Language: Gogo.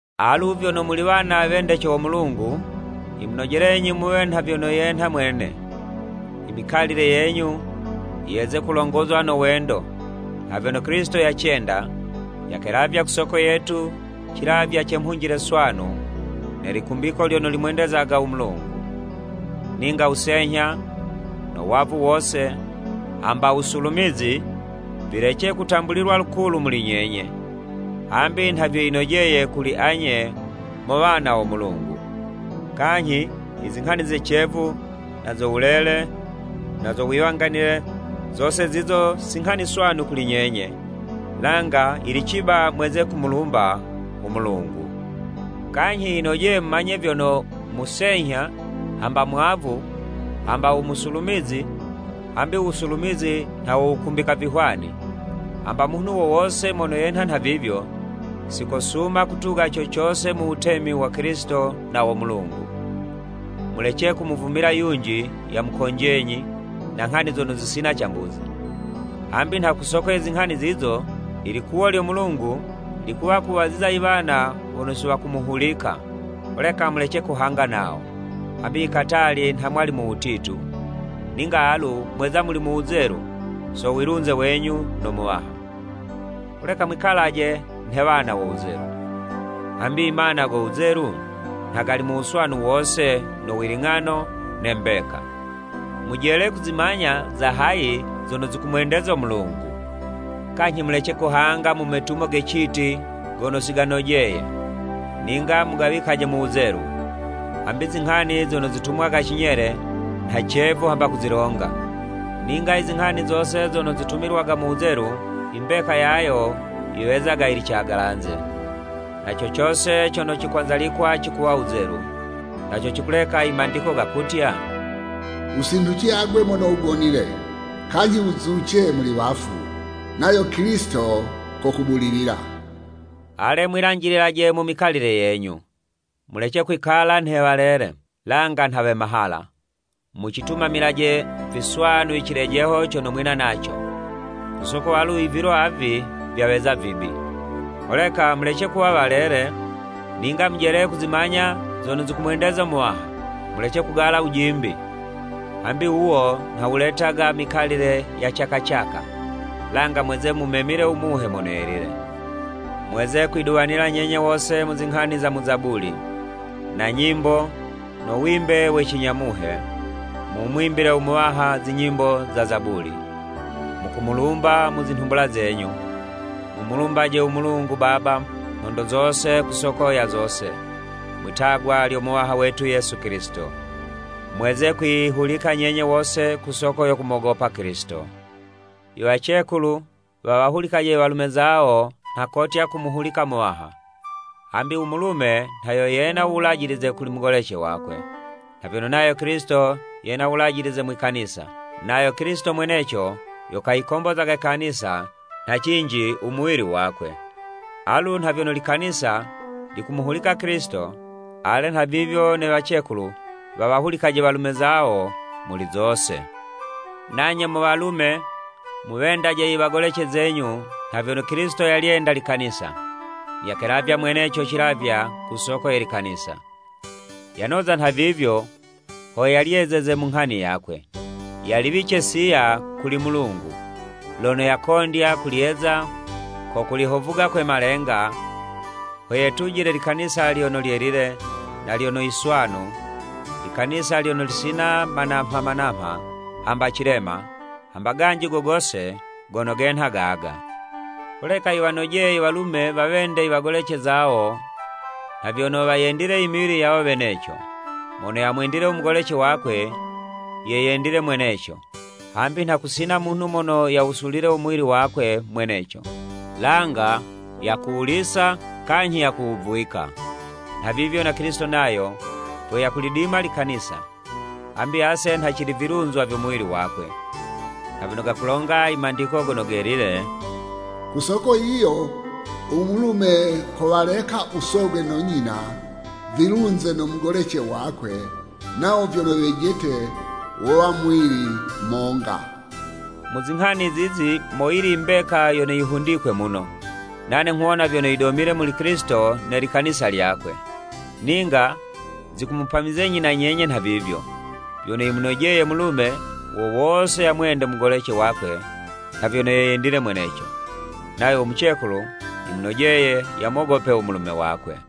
Alu vyono muli wana wendece wo Mulungu, yimunojelenyi muwe nha vyono yenha Mwene. Imikalile yenyu yeze kulongozwa no wendo, nha vyono Kilisito yacenda, yakelavya ku soko yetu cilavywa ce mhunjile swanu ne likumbiko lyono limwendezaga u Mulungu. Ninga wusenyha, no wavu wose, hamba wusulumizi, vilece kutambulilwa lukulu muli nyenye, hambi nha vyo yinojeye kuli anye mo wana wo Mulungu. Kanyhi i zinghani ze cevu, na zo wulele, na zo wiwanganile, zose zizo si nghani swanu kuli nyenye, langa yili ciba mweze kumulumba u Mulungu. Kanyhi yinojeye mumanye vyono, musenyha, hamba mwavu, hamba u musulumizi (hambi u wusulumizi nha wo wukumbika vihwani,) hamba munhu wo wose mono yenha nhavivyo, si kosuma kutuga co cose mu wutemi wa Kilisito na wo Mulungu. Mulece kumuvumila yunji yamukonjenyi na nghani zono zisina cambuzi, hambi nha ku soko ye zinghani zizo, ilikuwo lyo Mulungu likuwa kuwaziza iwana wono si wakumuhulika. Holeka mulece kuhanga nawo. Hambi ikatali nha mwali mu wutitu, ninga alu mweza muli mu wuzelu so wilunze wenyu no Muwaha. Holeka mwikalaje nhe wana wo wuzelu, hambi imana go wuzelu nha gali mu wuswanu wose no wiling'ano ne mbeka. Mujele kuzimanya za hayi zono zikumwendeza u Muwaha, kanyhi mulece kuhanga mu metumo ge citi gono si ganojeye, ninga mugawikaje mu wuzelu. Hambi izinghani zono zitumwaga cinyele, nha cevu hamba kuzilonga. Ninga izinghani zose zono zitumilwaga mu wuzelu, imbeka yayo yiwezaga yili cagalanze. Na co cose cono cikwanzalikwa cikuwa wuzelu. Na co cikuleka i Mandiko gakutya, “Wusinhuce agwe mono wugonile: Kanyhi wuzuce muli wafu nayo Kilisito kokubulilila.” Ale mwilanjililaje mu mikalile yenyu. Mulece kwikala nhe walele, langa nha we mahala. Mucitumamilaje viswanu i cilejeho cono mwina naco, ku soko alu i vilo avi vyaweza vibi. Holeka mulece kuwa walele, ninga mujele kuzimanya zono zikumwendeza u Muwaha. Mulece kugala wujimbi, hambi wuwo nha wuletaga i mikalile ye caka caka, langa mweze mumemile u Muhe Mono Yelile. Mweze kwiduwanila nyenye wose mu zinghani za mu Zabuli, na nyimbo no wimbe we cinya Muhe, mumwimbile u Muwaha zinyimbo na Zabuli, mukumulumba mu zinhumbula zenyu. Mumulumbaje u Mulungu Baba nhondo zose ku soko ya zose, mwi'tagwa lyo Muwaha wetu Yesu Kilisito. Mweze kwiyihulika nyenye wose ku soko yo kumogopa Kilisito. Iwacekulu wawahulikaje iwalume zawo nha kotya kumuhulika Muwaha. Hambi u mulume nha yo yena uwulajilize kuli mugolece wakwe, nha vyono nayo Kilisito yena wulajilize mwi Kanisa, nayo Kilisito mweneco yo kayikombozaga Kanisa nha cinji u muwili wakwe. Alu nha vyono Likanisa likumuhulika Kilisito, ale nhavivyo ne wacekulu wawahulikaje walume zawo muli zose. Nanye mo walume muwendaje iwagolece zenyu nha vyono Kilisito yalyenda Likanisa, yakelavya mweneco cilavywa ku soko ye Likanisa. Yanoza nhavivyo ho yalyezeze mu nghani yakwe, yaliwice siya kuli Mulungu, lono yakondya kulyeza ko kulihovuga kwe malenga, ho yetujile Likanisa lyono lyelile, na lyono yiswanu, Likanisa lyono lisina manamha manamha hamba cilema, hamba ganji go gose gono genha gaga. Holeka yiwanojeye i walume wawende iwagolece zawo nha vyono wayendile imiwili yawo weneco. Mono yamwendile u mugolece wakwe, ye yendile mweneco. Hambi nha kusina munhu mono yawusulile u muwili wakwe mweneco, langa yakuwulisa kanyhi yakuwuvwika. Nhavivyo na Kilisito nayo vyo yakulidima Likanisa, hambi ase nha cili vilunzwa vyo muwili wakwe. Nha vyono gakulonga i Mandiko Gono Gelile, “Ku soko yiyo u mulume kowaleka u Sogwe no nyina, vilunze no mugolece wakwe, nawo vyono wejete wowa muwili monga.” Mu zinghani zizi moyili i mbeka yono yihundikwe mumo, nane nghuwona vyono yidomile kuli Kilisito ne Likanisa lyakwe. Ninga zikumupamizenyi na nyenye nhavivyo, vyono yimunojeye mulume wo wose yamwende mugolece wakwe nha vyono ye yendile mweneco, nayo u mucekulu, yimunojeye yamogope u mulume wakwe.